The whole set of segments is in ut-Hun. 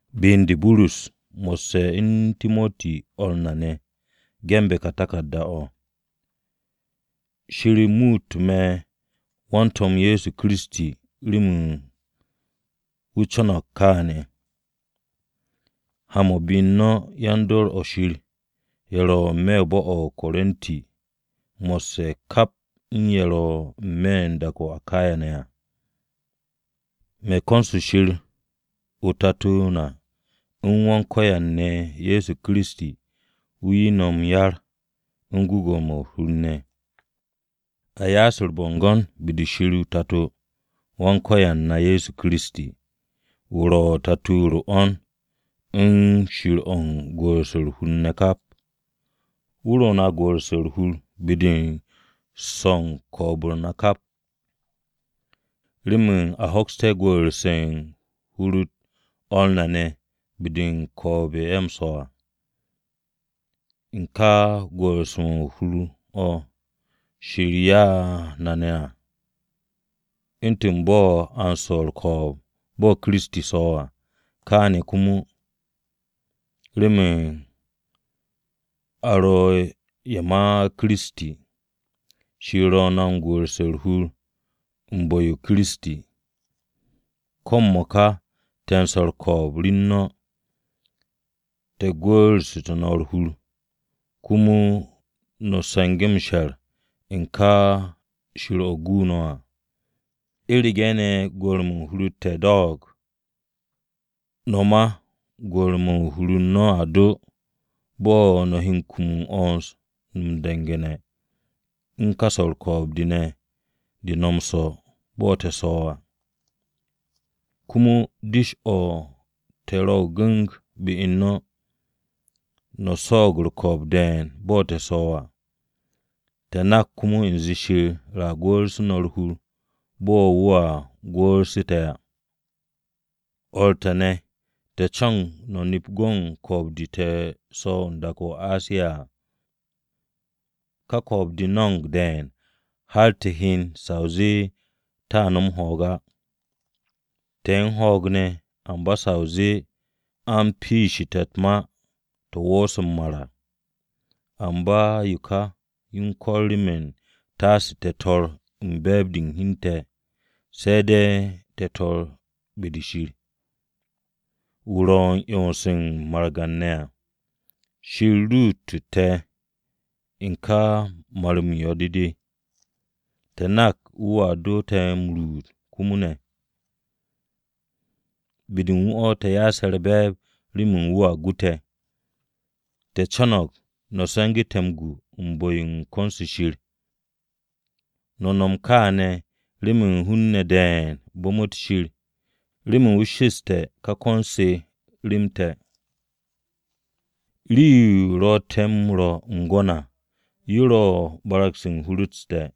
Be u̱n de, Burus, mo̱sse̱ u̱n Timoti o̱r na ne̱, ge̱nbe̱ ka taku̱rda-o̱. Shir muute̱ me̱ wan-To̱m Ye̱soKiristi remen wu̱ co̱no̱g kaane̱. Ha-mo̱ u̱n be-de u̱n yan-dor o̱ Shir ye̱ ro̱ n-me̱ bo̱-o̱ o-Korinti mo̱sse̱ kap u̱n ye̱ ro̱ n-me̱ u̱n dak-o̱ o-Akaya ne̱ à. Me̱ u̱s-ko̱n Shir Tato na u̱n Wan-Ko̱yan ne̱ Ye̱so Kiristi, wu̱ 'ye no̱ m-yar u̱n gwu̱gwu̱-mo̱ u̱r-hur ne̱. A ya'as u̱r-bo̱ngo̱n be-de Shir Tato-o Wan-Ko̱yan na Ye̱so Kiristi. Wu̱ ro̱ Tato-o̱ u̱r-'wo̱n u̱n Shir o̱ u̱n gwu̱'u̱rse̱ u̱r-hur ne̱ kap à. Wu̱ ro̱ na gwu̱'u̱rse̱ u̱r-hur be-de u̱n swo̱ u̱n ko̱o̱b-u̱r na kap, remen a hoksté̱ gwu̱'u̱rse̱ u̱n hur-u̱t o̱r na be-de u̱n ko̱o̱b-de ye̱ ro̱ m-swo̱ à, u̱n ka gwu̱'u̱rse̱ u̱r-hur o̱ Shir ya'u̱ na ne̱ à. U̱ntu̱n bo̱ a u̱n swo̱ u̱r-ko̱o̱b bo̱ Kiristi swo̱ à, kaane̱ komo, remen a ro̱ ye̱ ma Kiristi, Shir ro̱ na gwu̱'u̱rse̱ u̱r-hur u̱n bu̱-o Kiristi. Ko̱ m-mo̱ka te̱ m-swo̱ u̱r-ko̱o̱b rem no̱, te̱ gwu̱'u̱rsu̱tú̱ no̱ u̱r-hur, komo no̱ se̱nge̱té̱ m-she̱r u̱n ka Shir-o̱ gu no̱ à. U̱rege̱ ne̱ gwu̱'u̱re̱-mo̱ u̱n hur u̱n te̱ do̱o̱g, no̱ ma gwu̱'u̱re̱-mo̱ u̱n hur-u̱r no̱ a doo bo̱ no̱ he kum m-'wo̱ns mo̱ m-du̱ngu̱ne̱ u̱n ka swo̱ u̱r-ko̱o̱b de no̱ m-swo̱ bo̱ te̱ swo̱ à. Komo dish-o te̱ ro̱ gu̱ng be-u̱r no̱. No̱ swo̱o̱g u̱r-ko̱o̱b de̱e̱n bo̱ te̱ swo̱ à, te̱ nak komo u̱nze Shir a gwu̱'u̱rsu̱ no̱ u̱r-hur bo̱ wu̱a gwu̱'u̱rsu̱ te̱ à. O̱r te̱ ne̱, te̱ co̱no̱g no̱ nep go̱n ko̱o̱b-de te̱ swo̱ u̱n dak-o̱ o-Asiya à. Ka swo̱ u̱r-ko̱o̱b de no̱mo̱g de̱e̱n har te̱ hyen sa o zee te̱a nom ho̱o̱g á. Te̱ u̱n ho̱o̱g ne̱, amba sa o zee a u̱n piishe̱ te̱ u̱t-ma to̱ wo̱o̱se̱ m-mar à. Amba yo ka u̱n ko̱r remen taase te̱ tor u̱n be̱e̱b-de u̱n hi u̱n te̱, se̱ de̱ te̱ tor be-de Shir, wu̱ ro̱ m-'yons u̱n margan-ne̱ à. Shir ruutu̱ te̱ u̱n ka mar-m yo̱-mo̱ mo̱, te̱ nak wu̱a do̱ te̱ m-ruut komo ne̱. Be-de u̱n wu̱ o̱ te̱ ya'ase̱ u̱r-be̱e̱b remen wu̱a gu te̱. Te̱ co̱no̱g no̱ se̱ngu̱ te̱ m-gu u̱n bu̱-yo ko̱n-se Shir. No̱m no̱ kaane̱ remen hun-ne̱ de̱e̱n bu̱mu̱t Shir, remen wu̱ shaks ka ko̱n-se rem te̱. Rii-yo ro̱ te̱ m-rwo̱ m-gwo̱n à: Yo ro̱ hur u̱n te̱ kaps te̱ á,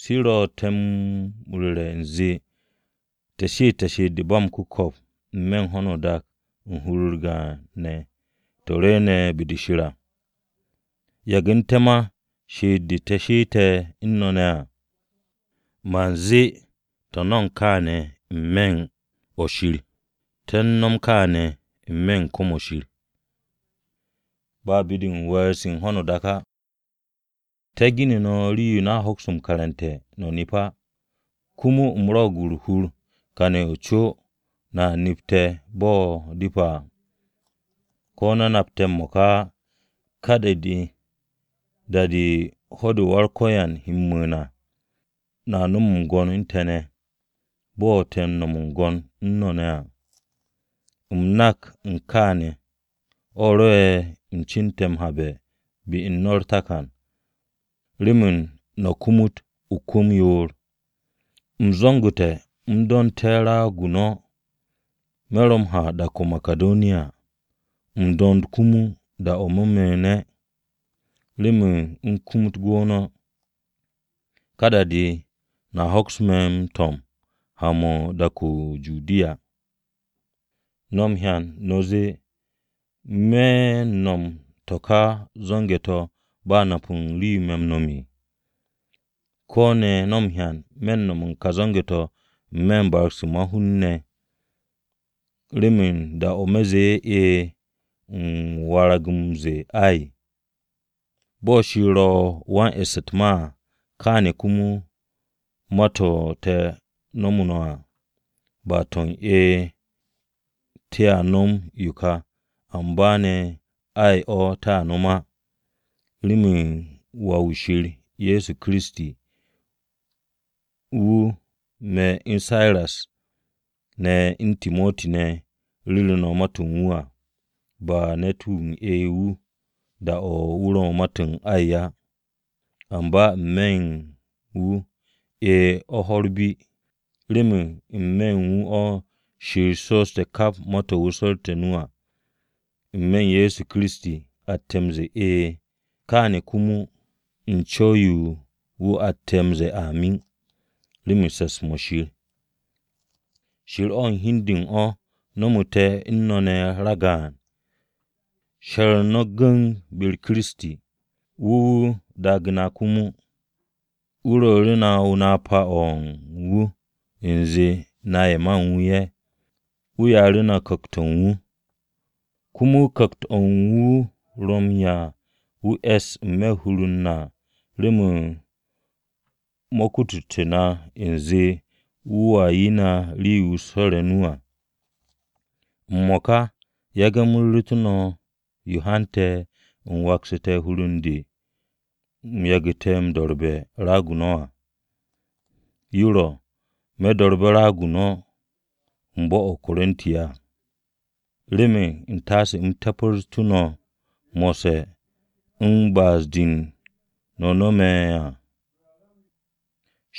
de ro̱ te̱ m-ru̱re̱ u̱nze te̱ she'ette̱ she'et-de u̱n ba m-ku̱ko̱p n-me̱ u̱n ho̱no o-dak u̱n hur-u̱r gaan ne̱ to̱ rwu̱u̱ne̱ be-de Shir à. Yagu̱nte̱ ma she'et-de te̱ she'ette̱ u̱n no̱ ne̱ á. Man zee te̱ no̱mo̱g kaane̱ n-me̱ u̱n o̱ Shir. Te̱ u̱n nom kaane̱ n-me̱ kwu̱m-o̱ Shir, ba be-de u̱n we̱e̱r-se u̱n ho̱no o-dak á. Te̱ ge̱nu̱ no̱ rii-yo no̱a hoks m-karante̱ no̱ nep á. Komo u̱m rwo̱'o̱g u̱r-hur kane̱ o-co no̱a nep te̱ bo̱ depe̱ à, ko̱ no̱ nap te̱ m-mo̱ka á. Ka da-de, da-de ho̱-de Wan-Ko̱yan Ye̱so he m-mu̱u̱n à, no̱a nom m-gwo̱n u̱n te̱ ne̱, bo̱ te̱ m-nom m-gwo̱n u̱n no̱ ne̱ à. U̱m nak u̱n kaane̱ ne̱, o̱ rwo̱'e̱ u̱m cu̱nte̱ m-habe̱ be u̱n no̱ u̱r-takan, remen no̱ kumut o-kwu̱m o-yoor. U̱m zo̱ngu̱te̱ u̱m do̱nte̱ raag-o no̱ me̱ ro̱ m-ha dak-o̱ o-Makidoniya u̱m do̱nd komo da-o̱ me̱ mu̱u̱ne̱, remen u̱m kumut gwu̱ no̱. Ka da-de no̱a hoks me̱ m-to̱m ha-mo̱ u̱n dak-o̱ o-Judiya. No̱ m-hyan no̱ zee ¿me̱ u̱n no̱m to̱ ka zo̱nge̱-to̱ ba m-nap u̱n yo me̱ m-nom? ¿Ko̱ ne̱ no̱ m-hyan me̱ u̱n no̱m ka zo̱nge̱-to̱ n-me̱ u̱n barag-se ma-hun ne̱, remen da-o̱ me̱ zee “E̱e̱,” u̱m warag m-ze̱e̱ “Ay”? Bo̱ Shir ro̱ wan-e̱ss u̱t-ma à, kaane̱ komo ma-to̱ te̱ nomu̱ no̱ à, ba to̱ u̱n “E̱e̱, te̱a no̱m yo ka” amba ne̱, “Ay” o̱ te̱ u̱t-ma á. Remen Wà-wu̱ Shir Ye̱so Kiristi, wu̱, me̱ u̱n Siras ne̱ u̱n Timoti ne̱ ru̱ru̱ no̱ ma-to̱ u̱n wu̱ à, ba ne̱t-wu̱ u̱n “E̱e̱” wu̱ da-o̱ wu̱ ro̱ ma-to̱ u̱n “Ay” á. Amba n-me̱ u̱n wu̱ “E̱e̱” o̱ ho̱-u̱r bi. Remen n-me̱ u̱n wu̱ o̱ Shir shooste̱ kap ma-to̱ wu̱ su̱rte̱ o-nu à, n-me̱ u̱n Ye̱so Kiristi atte̱ m-ze̱e̱, “E̱e̱” Kaane̱ komo u̱n co̱w-yo u̱n wu̱ atte̱ m-ze̱e̱, “Amin” remen se̱ps-mo̱ Shir. Shir o̱ u̱n hi u̱n de u̱n o̱ no̱mu̱ te̱ u̱n no̱ ne̱ ragaan, she̱r no̱ gu̱ng be-u̱r Kiristi, wu̱ wu̱ daage̱ na komo. Wu̱ ru̱'u̱ru̱ na napa-o̱ u̱n wu̱ u̱nze na ye̱ ma u̱n wu̱ ye̱. Wu̱ ya'u̱ru̱ na Ku̱kt-o̱ u̱n wu̱. Komo Ku̱kt-o̱ u̱n wu̱ ro̱ na m-e̱se̱ n-me̱ u̱n hur-u̱r na remen mo̱ kututé̱ na u̱nze wu̱a 'ye na rii-yo wu̱ swo̱re̱ o-nu à. M-mo̱ka, yage̱ u̱m ru̱ru̱te̱ no̱ yo hante̱ u̱m waksu̱te̱ hur u̱n de u̱m yagu̱te̱ m-do̱rbe̱ raag-o no̱ á. Yo ro̱, me̱ do̱rbe̱ raag-o no̱ u̱n bo̱-o̱ o-Korinti, remen u̱ntaase u̱m te̱pru̱ no̱ mo̱sse̱ u̱n ba'as-de no̱ no̱me̱ ne̱ à.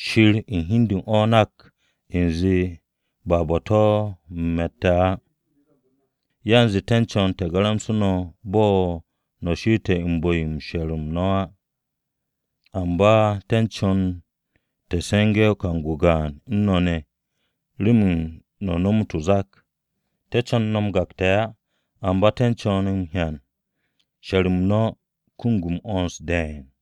Shir u̱n hi u̱n de u̱n o̱ nak u̱nze ba bo̱-to̱ u̱m me̱tte̱ á. Yanze te̱ u̱n co̱n te̱ garamse̱ no̱ bo̱ no̱ she'ete̱ u̱n bu̱-yo she̱r-m no̱ á. Amba te̱ co̱no̱g te̱ se̱nge̱ kang-o gaan u̱n no̱ ne̱, remen no̱ nomot o-zak. Te̱ co̱n no̱ m-gakte̱ á, amba te̱ co̱no̱g m-hyan she̱r-m no̱ kum m-'wo̱ns de̱e̱n.